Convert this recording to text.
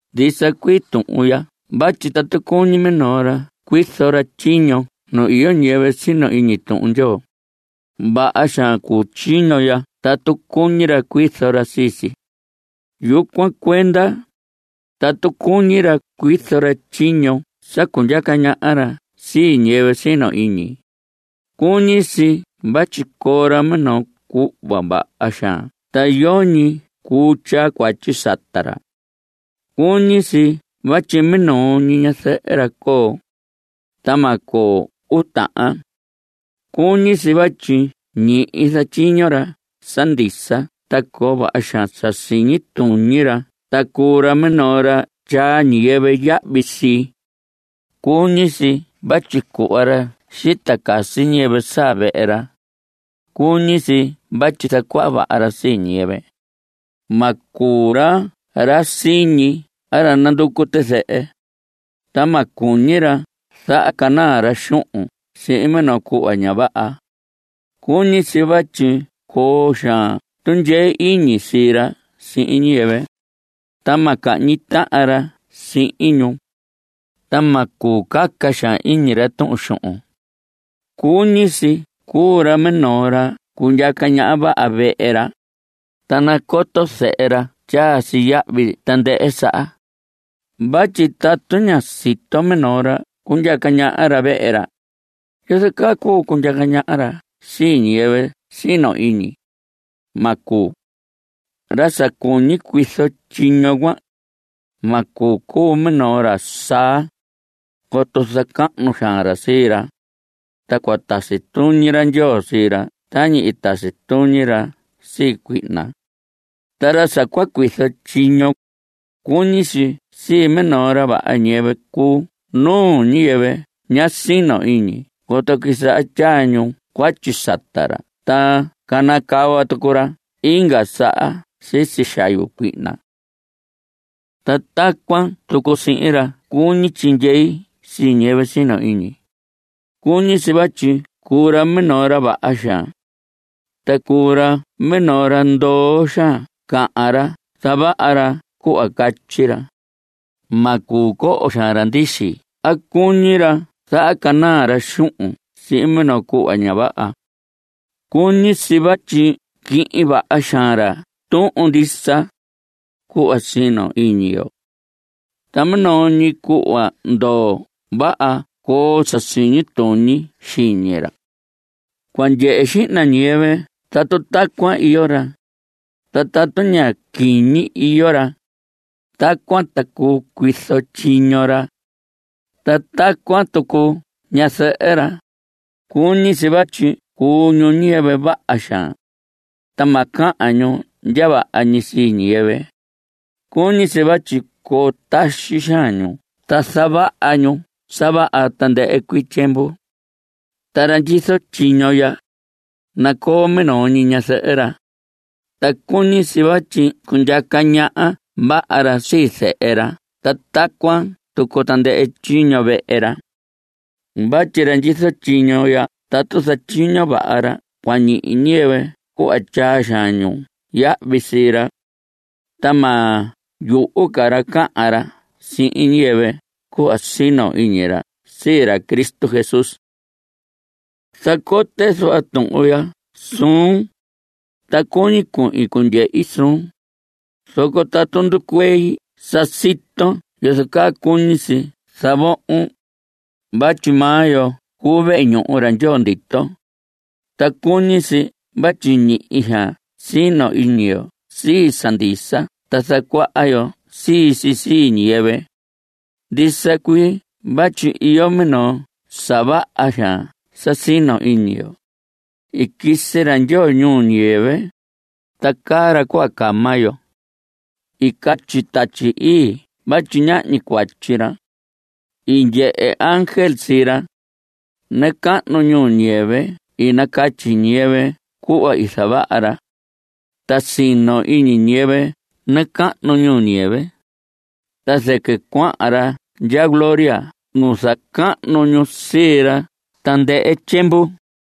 Ndisa cuii tuhun ya vatyi tatu cuñi minoo ra cuizo ra tyiño nu iyo ñiyɨvɨ sino iñi Tuhun Ndyoo, vaha xaan cuu tyiño ya tatu cuñi ra cuizo ra sii si. Yucuan cuenda, tatu cuñi ra cuizo ra tyiño sa cundyaca ñaha ra sii ñiyɨvɨ sino iñi, cuñi si vatyi coo ra minoo cuhva vaha xaan ta yoñi cuu tyaa cuatyi sata ra. Cuñi si vatyi minoo ñi ñazɨhɨ ra coo, ta ma coo uu tahan. Cuñi si vatyi ñihi zatyiño ra sa ndisa ta coo vaha xaan sa siñi tuñi ra ta cuu ra minoo ra tyaa ñiyɨvɨ yahvi sii. Cuñi si vatyi cuhva ra xita casi ñiyɨvɨ saa vehe ra. Cuñi si vatyi zacuaha vaha ra sii ñiyɨvɨ. Ma cuu ra ra siñi a ra nanducu tizɨhɨ. Ta ma cuñi ra zahacanaa ra xuhun sihin minoo cuhva ña vaha. Cuñi si vatyi coo xaan tundyee iñi sii ra sihin ñiyɨvɨ, ta ma cahñi tahan ra sihin ñu, ta ma cuu caca xaan iñi ra tuhun xuhun. Cuñi si cuu ra minoo ra cundyaca ñaha vaha vehe ra, ta nacoto zehe ra tyaa si yahvi tandɨhɨ saha. Vatyi tatu ña sito minoo ra cundyaca ñaha ra vehe ra ¿yozo caa cuu cundyaca ñaha ra sii ñiyɨvɨ sino iñi? Ma cuu. Ra sa cuñi cuizo tyiño cuan, ma cuu cuu minoo ra saa, coto zacahnu xaan ra sii ra, ta cua tasi tuñi ra Ndyoo sii ra tañi i tasi tuñi ra sii cuihna. Ta ra sa cua cuizo tyiño, cuñi si minoo ra vaha ñiyɨvɨ cuu nuu ñiyɨvɨ ña sino iñi coto quisaha tyaa ñu cuatyi sata ra ta canacava tucu ra inga saha sisi xayu cuihna. Ta tacuan tucu sihin ra cuñi tyindyee sii ñiyɨvɨ sino iñi, cuñi si vatyi cuu ra minoo ra vaha xaan. Ta cuu ra minoo ra ndoo xaan cahan ta zavaha ra cuhva catyi ra. Ma cuu coho xaan ra ndixi a cuñi ra zahacanaa ra xuhun sihin minoo cuhva ña vaha. Cuñi si vatyi quihin vaha xaan ra tuhun ndisa, cuhva sino iñi yo. Ta minoo ñi cuhva ndoo vaha coo sa siñi tuñi xiñi ra. Cua ndyehe xihna ñiyɨvɨ tatu tacuan iyo ra, ta tatu ña quiñi iyo ra, tacuan ta cuu cuizo tyiño ra. Ta tacuan tucu ñazɨhɨ ra, cuñi si vatyi cuu ñu ñiyɨvɨ vaha xaan. Ta ma cahan ñu ndya vaha ñi sii ñiyɨvɨ. Cuñi si vatyi coo taxi xaan ñu ta zavaha ñu sa vaha tandɨhɨ cuii tyiemvu. Ta ra ndyizo tyiño ya, nacoo minoo ñi ñazɨhɨ ra. Ta cuñi si vatyi cundyaca ñaha vaha ra sii zehe ra ta tacuan tucu tandɨhɨ tyiño vehe ra. Vatyi ra ndyizo tyiño ya tatu zatyiño vaha ra cua ñihi ñiyɨvɨ cuhva tyaa xaan ñu yahvi sii ra. Ta ma yuhu ca ra cahan ra sihin ñiyɨvɨ cuhva sino iñi ra sii ra Cristo Jesús. Zacote zuhva tuhun ya suun, ta cuñi cuhin cundyehi suun, zoco tatu nducuei sa siton yozo caa cuñi si zavohon. Vatyi maa yo cuu vehe ñuhu ra Ndyoo ndito. Ta cuñi si vatyi ñihi xaan sino iñi yo sii sa ndisa ta zacuaha yo sii si sii ñiyɨvɨ. Ndisa cuii vatyi iyo minoo sa vaha xaan sa sino iñi yo: I quisi ra Ndyoo ñuu ñiyɨvɨ, ta caa ra cuhva caa maa yo. I catyi Tatyi Ii vatyi ñahñi cuatyi ra. I ndyehe ángel sii ra. Nacahnu ñuu ñiyɨvɨ i nacatyi ñiyɨvɨ cuhva i zavaha ra. Ta sino iñi ñiyɨvɨ nacahnu ñuu ñiyɨvɨ. Ta zɨquɨ cuahan ra ndya gloria nu zacahnu ñu sii ra tandɨhɨ tyiemvu.